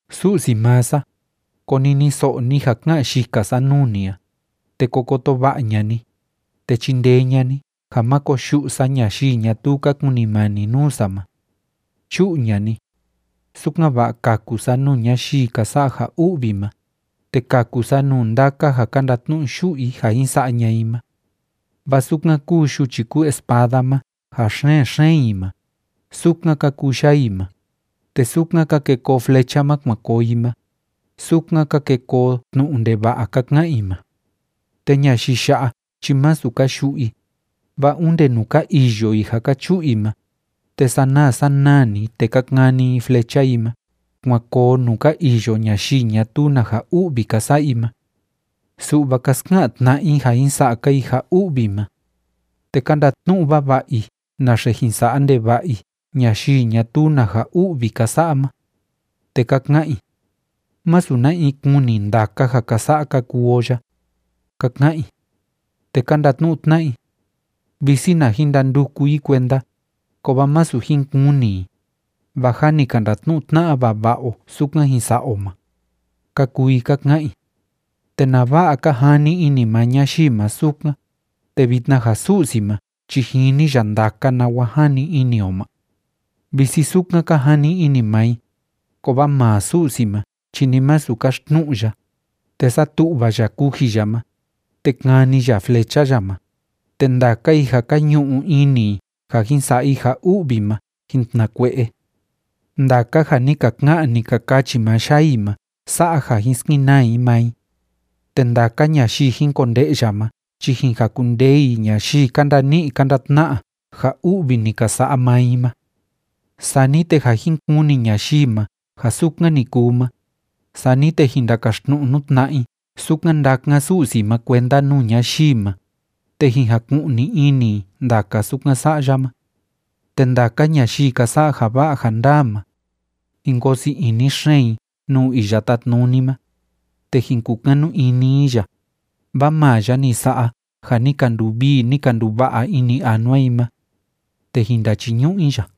Su'si maa sa, koniniso'o ni ja ká'an yika sa nuu ni a, te ko koto va'a ña'a ni, te chindee ña'a ni ja má koyu'u sa ñayii ñatuu ka kunimani nuu sa ma. Chu'u ña'a ni, sukan‑va'a kaku sa nuu ñayii ka sa'a ja u'vi ma, te kaku sa nuu ndaka ja ka ndatnu'u yu'u i ja jin sa'a ña'a i ma. Vaa sukan kúu yuchi kúu espada ma ja xen‑xeen i ma, sukan ka kuu yaa i ma, te sukan ka ke koo flecha ma kuan koo i ma, sukan ka ke koo tnu'u ndeva'a ka ka'an i ma. Te ñayii ya'a chi másu ka yu'u i, vaa onde nuu ka iyo i ja ka chu'u i ma, te sanaa sanaa‑ni, te ka kani i flecha i ma kuan koo nuu ka iyo ñayii ñatuu na ja u'vi ka sa'a i ma. Su'va ka ska'an tna'a i ja jin sa'a‑ka i ja u'vi ma, te ka ndatnu'u vava'a i naxe jin sa'a ndeva'a i ñayii ñatuu na ja u'vi ka sa'a ma. Te ka ka'an i: “Másu na in kuni ndaka ja ka sa'a ka kuu o ya”, ka ka'an i. Te ka ndatnu'u tna'a i: “Visi na jin ndanduku i kuenda, kovaa masu jin kuni i, vaa jâ ni ka ndatnu'u tna'a vava'a o sukan jin sa'a o ma”, ka kuu i ka ka'an i. ¿Te nava'a ka jani ini maa ñayii ma sukan, te vitna ja Su'si ma chi jini ya ndaka nawa jani ini o ma? Visi sukan ka jani ini maa i, kovaa maa Su'si ma chi ni masu kaxtnu'u ya, te satu'va ya kuji ya ma, te kani ya flecha ya ma, te ndaka i ja ka ñu'u ini i ja jin sa'a i ja u'vi ma jin tnakue'e. Ndaka ja ni ka ka'an, ni ka kachi maa yaa i ma sa'a ja jin skenaa i maa i, te ndaka ñayii jin konde'ya ma chi jin jakundee i ñayii ka ndani'i ka ndatna'a ja u'vi ni ka sa'a maa i ma. Sani te ja jin kuni ñayii ma ja sukan ni kuu ma, sani te jin ndakaxtnu'u nuu tna'a i sukan ndákan Su'si ma kuenda nuu ñayii ma, te jin jaku'ni ini i ndaka sukan sa'a ya ma. Te ndaka ñayii ka sa'a ja va'a ja ndaa ma, jin koo sii ini xeen i nuu Iya Tátnuni ma, te jin kukanu ini i ya, vaa maa ya ni sa'a ja ni ka nduvii, ni ka nduva'a ini anua i ma. Te jin ndachiñu'u i ya.